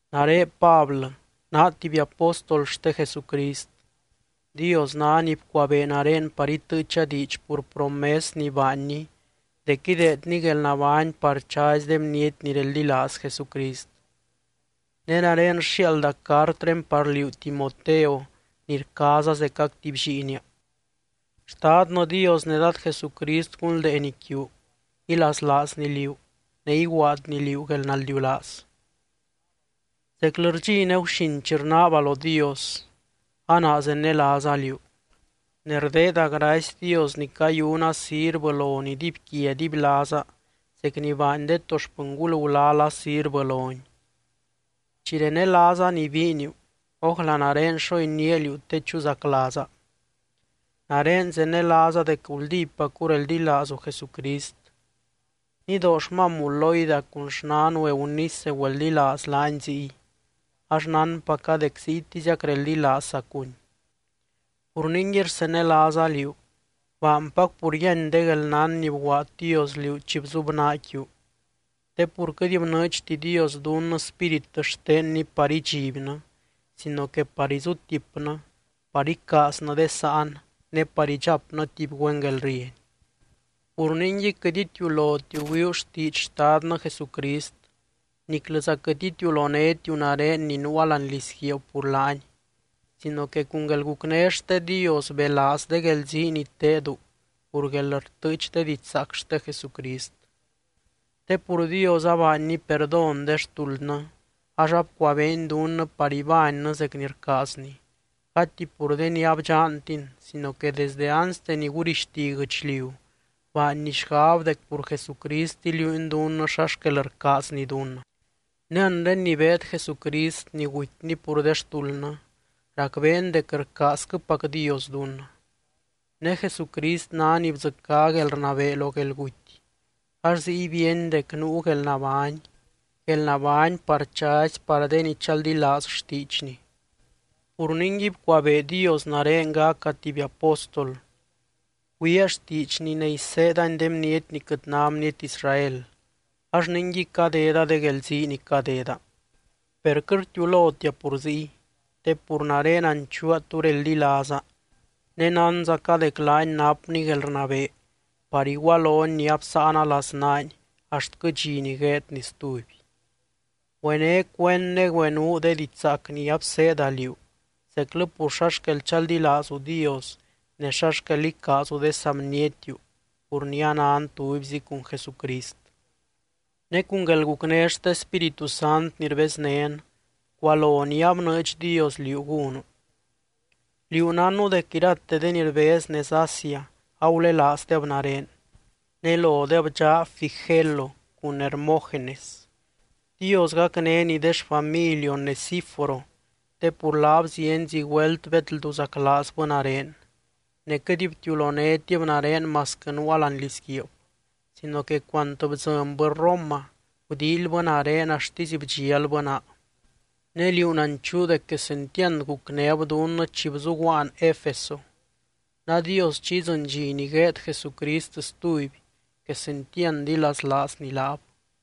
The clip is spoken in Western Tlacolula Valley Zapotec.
Nare Pablɨ, naa tuby apóstol xte Jesucrist. Dios ná ni bcuabee nare par itɨɨcha diidx pur promes ni baanny dec ideedny guelnabány par chazy de bniety ni reldilaaz Jesucrist. Ne nare rxiaalda cartré par liú Timoteo ni rcaaza zecac tuby lliinia. Xtadnɨ Dios ne Dad Jesucrist gunldeeny quiu, ilaslaazny liú, ne iguaadny liú guelnaldiulaaz. Zeclɨ rdxi ne guxin chi rnaaba lo Dios, a naa zenelaaza liú, ne rdeeda gracy Dios ni cayuna sirvɨ lony dibyquia dibylaaza zec ni baany de to xpɨngul gulala sirvɨ lony. Chi renelaaza ni biiniu, ójla nare xo iniáa liú te chuzaclaaza. Nare zenelaaza dec guldípacu reldilaazu Jesucrist. Nidoo xmamu Loida cun xnanu Eunice güeldilaaz laany ziy, ax nánpaca dec ziytiziac reldilaazzacuny. Pur ningui rsenelaaza liú, baanpac pur yíany de guelnán ni bguaad Dios liú chi bzubnaa quiu. Te pur quɨt bnɨɨdxti Dios dunnɨ Spírit xtenny par idxibnɨ sino que par izutipnɨ, par icaaznɨ de sáan, ne par idxapnɨ tuby güen guelrieny. Pur ningui, quɨt itiulotiu güiuu xtiidx Xtadnɨ Jesucrist, niclɨza quɨt itiulonétiu nare ni nuua láani lizguiib pur laany, sino que cun guelgucné xte Dios belaaz de guelzii ni tedu pur guelrtɨɨch de didxzaac xte Jesucrist. Te pur Dios abaanny perdón de xtuldnɨ ax abcuabeeny dunnɨ par ibánnɨ zec ni rcaazny, gati pur de ni abdxantin sino que desde anste ni gurixti guɨchliu baanny xgab dec pur Jesucrist iliuuny dunnɨ xa xquel rcaazny dunnɨ. Ne anre ni beed Jesucrist ni gutyny pur de xtuldnɨ, racbeen dec rcaazquɨpac Dios dunnɨ. Ne Jesucrist ná ni bdzɨcá guelrnabee lo guelguty ax ziy bíeny dec nuu guelnabány, guelnabány par chazy par de ni chaldilaaz xtiidxny. Pur ningui bcuabee Dios nare gaca tuby apóstol, güiaa xtiidxny ne iseedani de bniety ni quɨt ná bniety Israel, ax ninguiy cadeda de guelzii ni cadeda. Per quɨt rtiulotia pur ziy, te pur nare nanchuua tú reldilaaza, ne nánzaca dec laany napny guelrnabee par igualony ni absáana laznaany axtquɨ dxi ni gueedny stuby. Güené cuend ne güenuu de diidx zaac ni abseeda liú zeclɨ pur xa xquel chaldilaazu Dios ne xa xquel icaazu de saa bnietiu pur ni anan tubyzi cun Jesucrist. Ne cun guelgucné xte Spíritu Sant ni rbeznén, bcualo ni abnɨɨdx Dios liú gúnu. Liú nánnu dec irate de ni rbez nez Asia agulelaazdeb nare, ne lodeb dxaa Figelo cun Hermógenes. Dios gacnény de xfamily Onesíforo, te pur laab zienzi güelt bedlduzaclaazbɨ nare. Ne quɨt btiulonétib nare masquɨ nuua láani lizguiib, sino que cuant bdzɨnbɨ Roma, gudíilybɨ nare axtisy bdxialbɨ naa. Ne liú nanchuu dec quesentiand gucnéb dunnɨ chi bzuguaan Efeso. Nadios chi idzɨny dxi ni gueed Jesucrist stuby, quesentiand ilaslaazny laab.